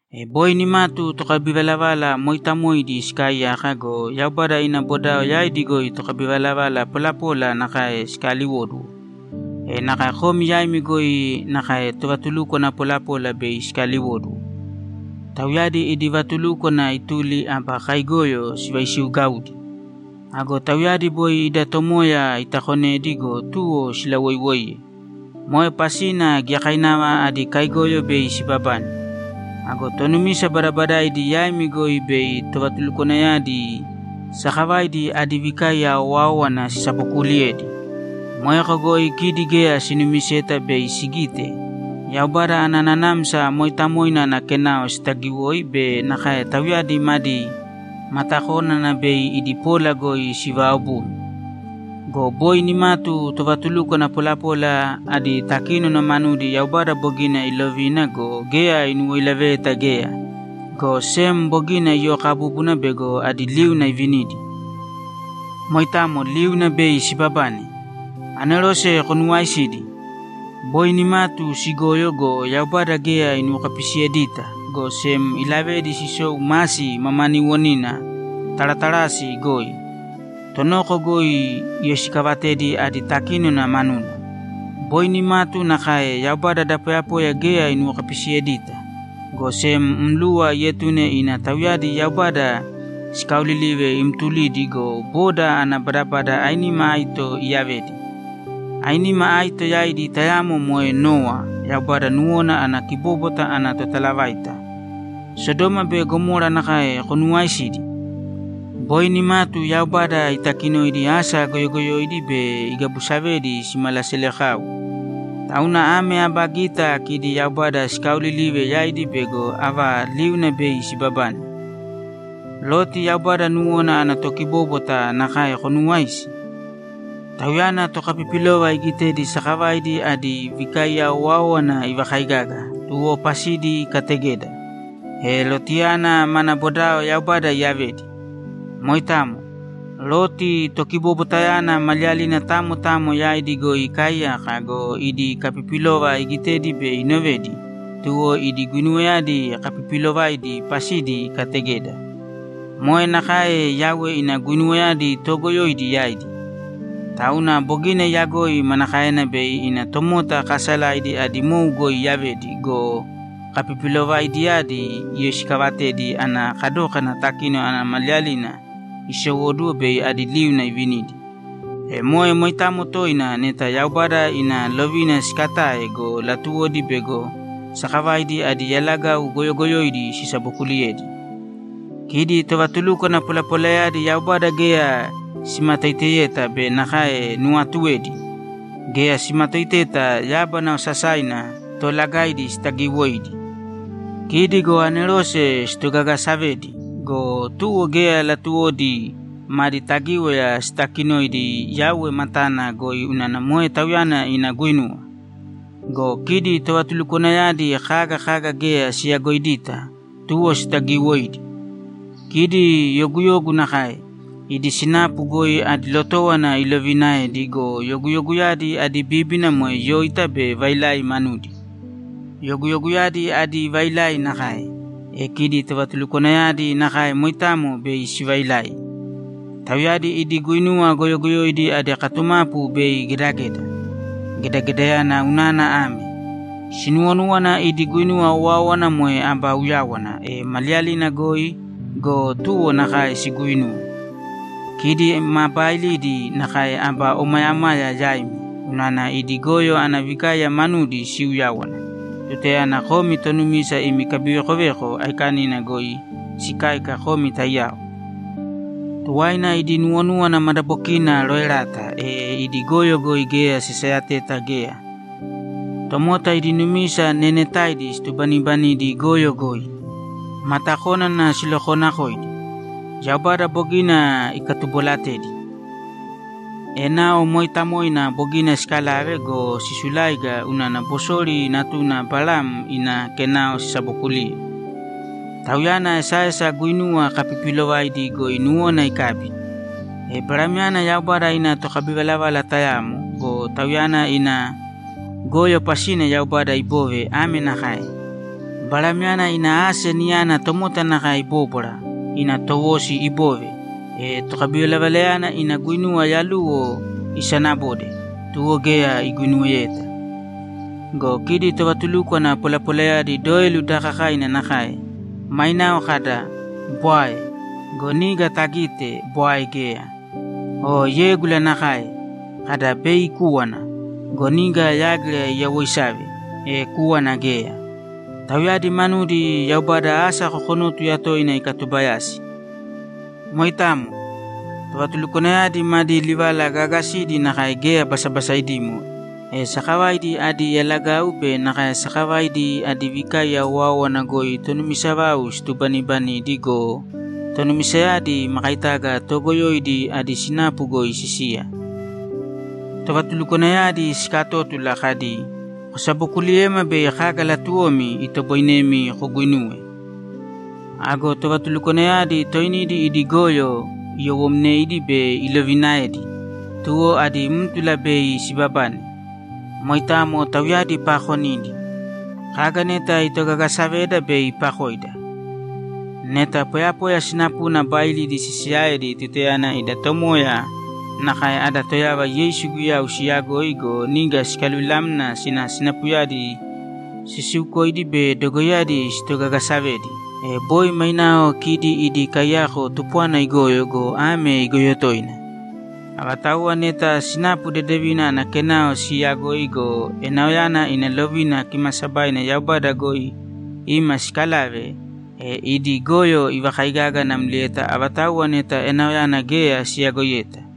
E boi nimatu tokabivalavala mooitamoidi sikaaiyaka go, Yaubada ina bodao yaidi goi tokabivalavala polapola nakae sikaliwóduwo. E nakae komi yaimi goi nakae tovatulukwana polapola bei sikaliwóduwo. Tauyadi idi vatulúkwana ituli aba kaigoyo sivaisiugaudi. Ago tauyadi boi ida Tomoya itakonedi go, tuwo silawoiwoiye. Moe pasina giyakainava adi kaigoyo bei sibabane. Ago tonumisa badabadaidi yaimi goi bei tovatulukwanayadi sakavaidi adi vikaiya owáowana sisabokuuliyedi. Moeko goi kidi geya sinumiseta bei sigite, Yaubada ana Nanamsa Mooitamoina ana kenao sitagiwoi be nakae tauyadi madi matakónana bei idi pola goi sivaobumi. Go boi nimatu tovatulukwana polapola adi takínona manudi Yaubada bogina ilovina go, geya inuwoilaveyeta geya, go sem bogina iyokabúbuna bego adi liuna ivinidi. Moitamo liuna bei sibabane. Anerose konuwaisidi? Boi nimatu sigoyo go, Yaubada geya inuwokapisiyedita, go sem ilavedi sisou masi mamaniiwonina Taratarasi goi. Tonoko goi iyoisikaavatedi adi takínona manuna. Boi nimatu nakae, Yaubada da poyapoya geya inuwokapisiyedita, go sem mluwa ietune ina tauyadi Yaubada sikaaolilive imtulidi go, boda ana badabada ainima aito iyavedi. Ainima aito yaidi tayamo moe Nowa Yaubada nuwona ana kibóbwata ana totalavaita. Sodoma be Gamora nakae konuwaisidi? Boi nimatu Yaubada itakinoidi asa goyogoyoidi be igabusavedi simalaselekau. Tauna ame aba gita kidi Yaubada sikaaolilive yaidi bego ava liuna bei sibabane. Loti Yaubada nuwona ana tokibóbwata nakae konuwaisi? Tauyana tokapipilova igitedi sakavaidi adi vikaiya owáowana ivakaigaga, tuwo pasidi ikategeda. E Lotiyana mana bodao Yaubada iyavedi. Moitamo. Loti tokibobwatayana maliyalina tamo tamo yaidi goi ikaaiyaka go, idi kapipilova igitedi be inovedi, tuwo idi guinuwayadi kapipiilovaidi pasidi ikategeda. Moe nakae Yauwe ina guinuwayadi toogoyoidi yaidi. Tauna bogina iyagoi manakaena bei ina tomota kaasalaidi adi mou goi iyavedi go, kapipilovaidiyadi iyoisikaavatedi ana kadókana takínona ana maliyalina isowóduwo bei adi liuna ivinidi. E moe moitamo toina neta Yaubada ina lovina siikatae go, latuwodi bego sakavaidi adi yalagau goyogoyoidi sisabokuuliyedi. Kidi tovatulukwana polapolayadi Yaubada geya simatoiteyeta be nakae nuwaatuedi! Geya simatoiteta yábana osasaina toolagaidi sitagiwoidi. Kidi go anerose sitogagasavedi go, tuwo geya latuwodi madi tagíwaya sitaakinoidi Yauwe matana goi unana moe Tauyana ina guinuwa. Go kidi tovatulukwanayadi kaga kaga geya siyagoidita, tuwo sitagiiwoidi. Kidi yoguyogu nakae; idi sinapu goi adi lotówona iloviinaedi go, yoguyoguyadi adi bíbina moe yóita be vailai manudi. Yoguyoguyadi adi vailai nakae, e kidi tovatulukwanayadi nakae moitamo bei sivailai. Tauyadi idi guinuwa goyogoyoidi adi katumapu bei gedageda. Gedagedayana unana ame: Sinuwonúwana idi guinuwa owáowana moe aba uyáwana, e maliyalina goi go, tuwo nakae siguuinuwe. Kidi ma baailidi nakae aba omayamaya yaimi, unana idi goyo ana vikaiya manudi siuyáwana, tutayana komi tonumisa imi kabivekoveko aikanina goi sikáika komi taiyao. Tuwaina idi nuwonúwana madabokina roerata, e idi goyo goi geya sisayateta geya. Tomota idi numisa neenetaidi situbaniibanidi goyo goi. Matakónana silokoonakoidi. Yaubada bogina ikatubolatedi. Enao mooitamoina bogina sikalave go, sisuláiga unana Bosori natuna Balam ina kenao sisabookuliye. Tauyana esaesa guinuwa kapipiilovaidi goi nuwona ikabi. E Balamyana Yaubada ina tokabivalavala tayamo go, tauyana ina goyo pasina Yaubada iboove ame nakae: Balamyana ina ase niyana tomota nakae ibóbwara, ina towosi ibove, e tokabivalavalayana ina guinuwa yaluwo isanabode, tuwo geya iguinuweyeta. Go kidi tovatulukwana polapolayadi doelu daakakaina nakae; mainao kada, ‘Bwae.’ Go niga tagite, bwae geya. O yégula nakae. Kada, ‘Bei ikúwana.’ Go niga yágira iyawoisave, e kúwana geya. Tauyadi manudi Yaubada asa kokonótuya toina ikatubayasi. Moitamo. Tovatulukwanayadi madi livala gaagasidi nakae geya basabasaidimo, e sakavaidi adi yalagau be nakae sakavaidi adi vikaiya owáowana goi tonumisa vau situbanibanidi go, tonumisayadi makaitaga toogoyoidi adi sinapu goi sisiya! Tovatulukwanayadi sikatótula kadi, ‘Kosabokuliyēma bei kaga latuwomi, itoboinemi koguinuwe.’ Ago tovatulukwanayadi toinidi idi goyo iyowomneidi be iloviinaedi, tuwo adí mtula bei sibabane. Moitamo tauyadi paakonidi. Kaga neta itogageesaveda bei iipakoida. Neta poyapoya sinapuna baailidi sisiyaedi tutayana ida Tomoya nakae ada Toyava Yeisu Guyau siyagoi go, niga sikaluvilamna sina sinapuyadi sisiukoidi be dogoiyadi sitogagasavedi, e boi mainao kidi idi kaiyako tupwana igoyo go, ame igoyo toina. Avatauwa neta sinapu dedevina ana kenao siiyagoi go, enaoyana ina lovina kimaasabaina Yaubada goi ima sikalave, e idi goyo ivakaigaga namlieta avatauwa neta enaoyana geya siyagoiyeta.